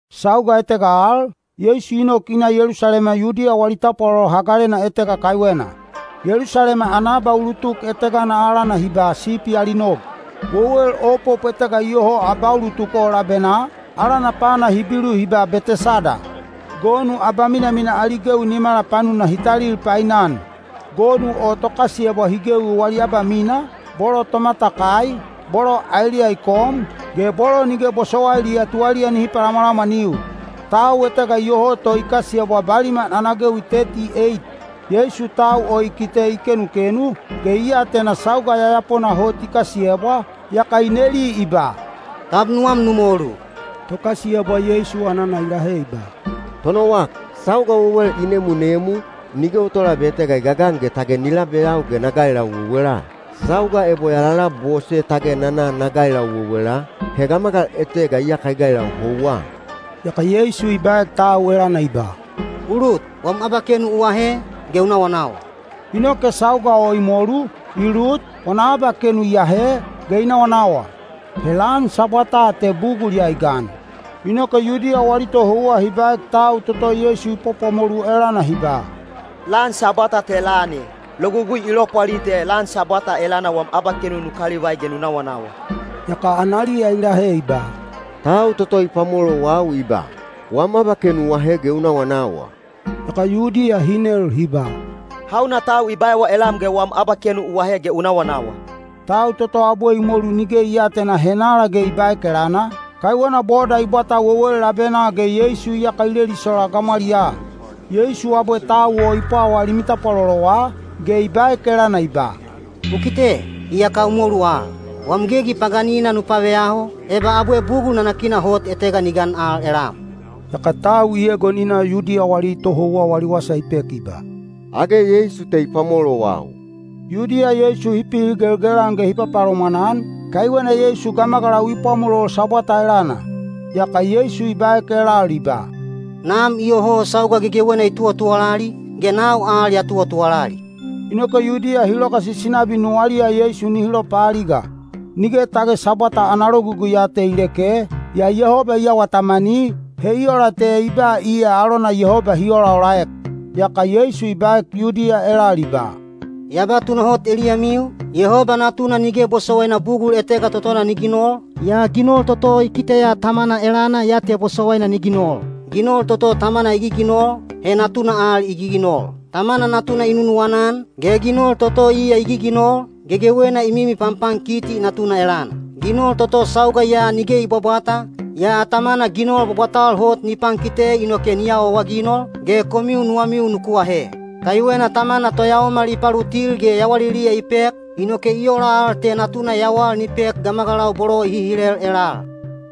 Sauga etega al, Yeisu i nok i na Yelusalema Yudiya wali tapwalolo hagalena etega kaiwena. Yelusalema ana abaulutuk etegana alana hi ba “Sipi ali Nog.” Wewel opop etega iyoho abaulutuk o labenaa, alana pana Hibilu hi ba Betesada. Gonu abaminamina ali gewi nimala panuna hi talil painan. Gonu o tokasiyebwa hi gewi wali abamina, bolo tomatakai, bolo aeliya i kom, ge bolo nige bosowailiya tuwaliya nihi palamwalamwaniu. Tau etega iyoho to i kasiyebwa baliman ana gewi teti eit. Yeisu tau o i kite i kenukenu, ge i atena sauga yayapona hot i kasiyebwa, yaka i neli i ba, “Tab nuwam nu molu?” Tokasiyebwa Yeisu anana i lahe i ba, “Tonowak, sauga wewel i nemunemu, nige o tolabe etega i gagan ge tage ni labeyau ge na gailau wewela. Sauga ebo ya lalabose tage na na na gailau wewela, he gamagal etega iyaka i gailau houwa.” Yaka Yeisu i baek tau elana i ba, “U lut, wam abakenu u ahe, ge u nawanawa.” Inoke sauga o i molu, i lut, wana abakenu i ahe, ge i nawanawa. He lan Sabwata te bugul ya i gan. Inoke Yudiya wali tohouwa hi baek tau toto Yeisu i pwapwamolu elana hi ba, “Lan Sabwata te lan e. Logugui i lopwali te lan Sabwata elana wam abakenu nu kalivai ge nu nawanawa.” Yaka analiya i lahe i ba, “Tau toto i pwamolowau i ba, ‘Wam abakenu u ahe ge u nawanawa.’” Yaka Yudiya hi nel hi ba, “Hauna tau i baewa elam ge wam abakenu u ahe ge u nawanawa?” Tau toto abwe i molu nige i aatena henala ge i baek elana, kaiwena boda i bwata wewel labenaa ge Yeisu iyaka i lelisola gamwaliyaa. Yeisu abwe tau o i pwawaa Limi Bwabwalena elana, ge i baek elana i ba, “U kite, iyaka u molu al. Wam gegi paganina nu paveyaho, eba abwe bugul nanakina hot etega ni gan al elam.” Yaka tau i egon i na Yudiya wali tohouwa wali wasa i pek i ba, “Age Yeisu te i pwamolowau.” Yudiya Yeisu hi pihigelgel-an ge hi papalomwan-an, kaiwena Yeisu gamagalau i pwamolol Sabwata elana. Yaka Yeisu i baek elal i ba, “Nam iyoho sauga gegewena i tuwatuwalali, ge nau al ya tuwatuwalali.” Inoke Yudiya hi logasisi nabi nuwaliya Yeisu nihi lopaaliga. Nige tage Sabwata ana logugui ya te i leke, yaa Yehoba i awa tamani, he i ola te i ba iya alona Yehoba hi olaolaek. Yaka Yeisu i baek Yudiya elal i ba, “Ya ba tunahot eliyamiu, Yehoba Natuna nige bosowaina bugul etega totona ni ginol, yaa ginol toto i kiteya Tamana elana ya te bosowaina ni ginol. Ginol toto Tamana i giginol, he Natuna al i giginol. Tamana Natuna i nunuwana-an, ge ginol toto iya i giginol, gegewena i mimi panpankiti Natuna elana. Ginol toto sauga ya nige i bwabwata, yaa Tamana ginol bwabwatal hot ni pankite inoke ni awaawaginol, ge komiu nuwamiu nuku ahe. Kaiwena Tamana toyaomal i palutil ge yawaliliya i pek, inoke i ola al te Natuna yawal ni pek gamagalau bolo i hihilel elal.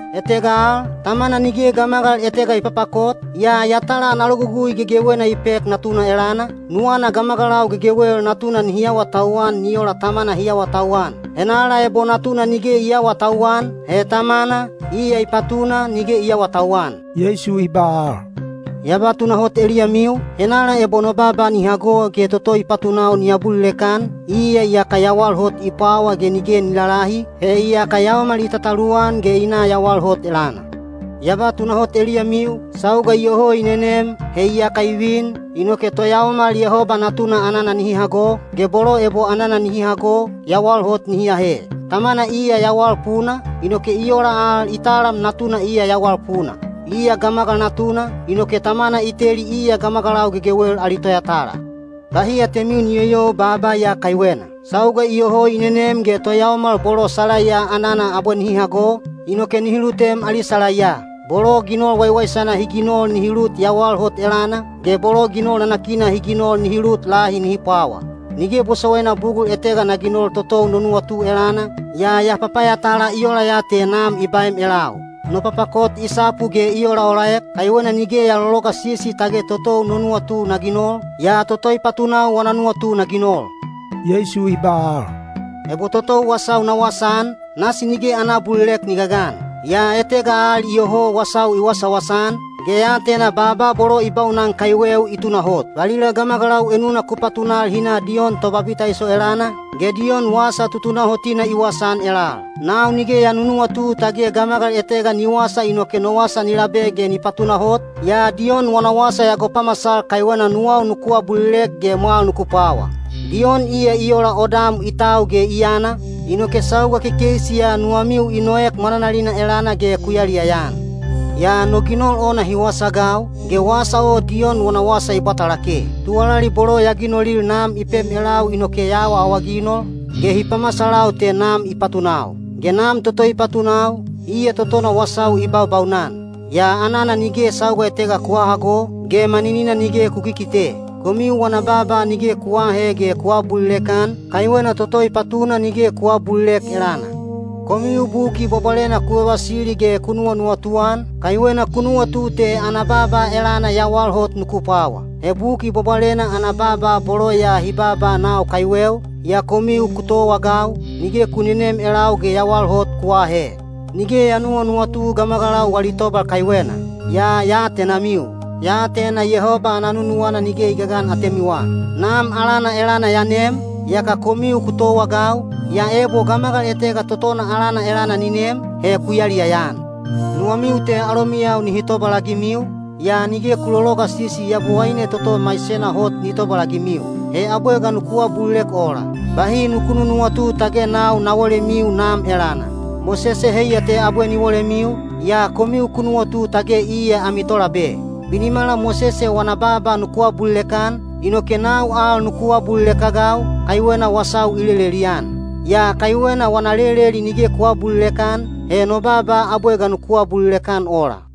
Etega al, Tamana nige gamagal etega i papakot, yaa yatala ana logugui gegewena i pek Natuna elana, nuwana gamagalau gegewel Natuna nihi awatauwan ni ola Tamana hi awatauwan. Henala ebo Natuna nige i aawatauwan, he Tamana, iya i patuna, nige i aawatauwan.” Yeisu i ba al, “Ya ba tunahot eliyamiu, henala ebo no baaba ni hago ge toto i patunau ni abulilek-an, iya iyaka yawal hot i pwawa ge nige ni lalahi, he iyaka yaomal i tataluwan ge i na yawal hot elana. Ya ba tunahot eliyamiu, sauga iyoho i nenem—he iyaka i vin—inoke toyaomal Yehoba Natuna anana nihi hago, ge bolo ebo anana nihi hago, yawal hot nihi ahe. Tamana iya yawal puna, inoke i ola al i talam Natuna iya yawal puna. Iya Gamagal Natuna, inoke Tamana i teli iya gamagalau gegewel ali toyatala. “Bahi atemiu ni yoyou baaba ya kaiwena: sauga iyoho i nenem ge toyaomal bolo salaiya anana abwe nihi hago, inoke nihi lutem ali salaiya. Bolo ginol waiwaisana hi ginol nihi lut yawal hot elana, ge bolo ginol nanakina hi ginol nihi lut lahi nihi pwawa. Nige bosowaina bugul etega na ginol totou no nuwatu elana, yaa ya papayatala i ola ya te Nam i baem elau. No papakot i sapu ge i olaolaek, kaiwena nige ya lologasisi tage totou no nuwatu na ginol, yaa toto i patunau wana nuwatu na ginol.” Yeisu i ba al, “Ebo totou wasau na wasaan, nasi nige ana abulilek ni gagan. Yaa etega al iyoho wasau i wasawasa-an, ge ya atena baaba bolo i baunan kaiweu i tunahot. “Valila gamagalau enuna ku patunal hi na Diyon Tobabitaiso elana, ge Diyon wasa tutunahotina i wasaan elal. Nau nige ya nunuwatu tage gamagal etega ni wasa inoke no wasa ni labe ge ni patunahot, yaa Diyon wana wasa ya gopamasal kaiwena nuwau nuku abulilek ge mwal nuku pwawa. Diyon iya i ola odam i tau ge i yana, inoke sauga kekeisi ya nuwamiu i noek mwananalina elana ge ku yaliyaya-an. “Yaa no ginol ona hi wasaagau, ge wasa o Diyon wana wasa i bwata lake. Tuwalali bolo ya ginolil Nam i pem elau inoke ya awaawaginol, ge hi pamasalau te Nam i patunau. Ge Nam toto i patunau, iya totona wasau i baubaunan. Yaa anana nige sauga etega ku hahago, ge maninina nige ku kikite. Komiu wana baaba nige ku aahe ge ku aabulilek-an, kaiwena toto i patuna nige ku aabulilek elana. Komiu Buki Bwabwalena ku vavasili ge ku nuwanuwatu-an, kaiwena ku nuwatu te ana baaba elana yawal hot nuku pwawa. He Buki Bwabwalena ana baaba bolo ya hi baaba nau kaiweu, yaa komiu ku towaagau, nige ku nenem elau ge yawal hot ku aahe. “Nige ya nuwanuwatu gamagalau wali tobal kaiwena. Yaa ya atenamiu; ya atena Yehoba ana nunuwana nige i gagan atemiwa. Nam alana elana ya nem, yaka komiu ku towaagau, yaa ebo gamagal etega totona alana elana ni nem, he ku yaliyaya-an. Nuwamiu te alomiyau nihi tobalagimiu, yaa nige ku lologasisi Yabowaine toto maisena hot ni tobalagimiu. He abwe ga nuku abulilek ola? “Bahi nuku nunuwatu tage nau na wolemiu Nam elana. Mosese heiya te abwe ni wolemiu, yaa komiu ku nuwatu tage iya ami tolabe. Binimala Mosese wana baaba nuku abulilek-an, inoke nau al nuku abulilek-agau, kaiwena wasau i lelelian. Yaa kaiwena wana leleli nige ku aabulilek-an, he no baaba abwe ga nuku abulilek-an ola?”